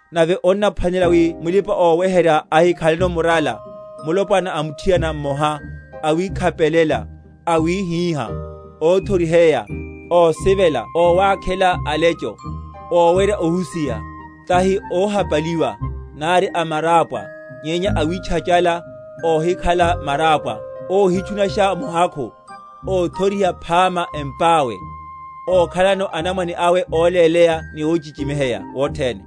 Nave onnaphwanelela wi mulipa‐oweherya ahikhaleno murala, mulopwana a muthiana mmoha, awikhapelela, awíhíha, óthoriheya, ósivela ówakhela alecho, ówerya ohusiha; tahi óhapaliwa, nari amarápwa; nyenya awitchachala, óhikhala marapwa, óhitchunasha muhakhu; óthoriha phama empáwéne, ókhalano anamwane awe óléleya ni óchichimiheya wothene.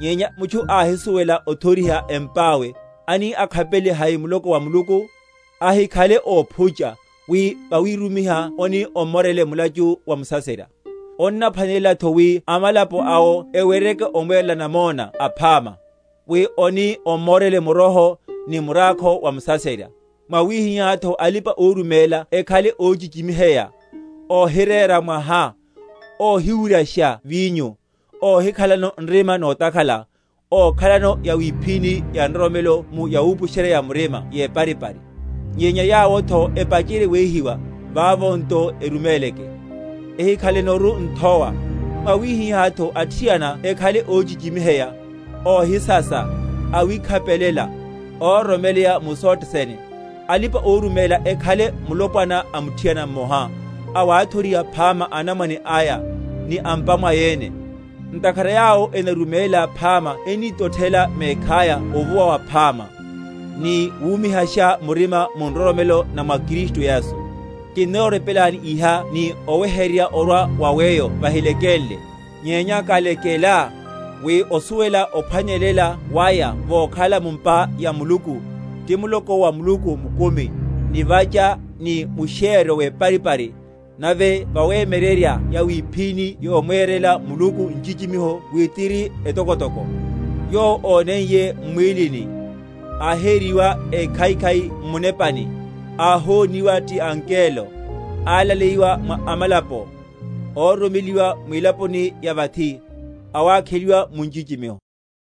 Nyenya mutchu áhisuwela othoriha empáwe, ani akhapelele hai muloko wa Muluku? Ahikhale óphucha, wi vawirumiha oni ommorele mulachu wa musaserya. Onnaphwanelelatho wi amalapo awo eweryeke omwerela namona aphama; wi oni ommorele muroho, ni murákho wa musaserya. Mwawihihátho alipa‐oruméla ekhale óchichimiheya, óhirera mwaha, óhiwuryasha vinyo, óhikhalano nrima notakhala; ókhalano yawiphíni ya nroromelo mu yawupusherya‐ya‐murima yeparipari. Nyenya yawotho epacherye wehiwa; vavo nto eruméleke, ehikhalenoru nthowa. Mwawihihátho athiana ekhale óchichimiheya, óhisasa, awikhapelela, óroromeleya mu sothe sene. Alipa‐oruméla ekhale mulopwana a muthiana mmoha, awathoriha phama anamwane aya, ni a’mpa mwaya ene. Ntakhara yawo enaruméla phama ennitothela mekhaya ovuwa waphama, ni wumihasha murima mu nroromelo na mwa Kristu Yesu. Kinnorepelani iha ni oweheryerya orwa wa weyo vahilekenle, nyenya kalekela, wi osuwele ophwanelela waya vokhala mu’mpa ya Muluku, ti muloko wa Muluku mukumi, nivacha ni mushéryo weparipari. Nave vawemyeryerya yawiphíni yomwerela Muluku nchichimiho wi tiri etokotoko; Yowo óneiye m’mwílini, áhériwa ékhaikhai m’munepani, áhoniwa ti angelo, alaleyiwa mwa amalapo, óroromeliwa mwilaponi ya vathi, awakheliwa mu nchichimiho.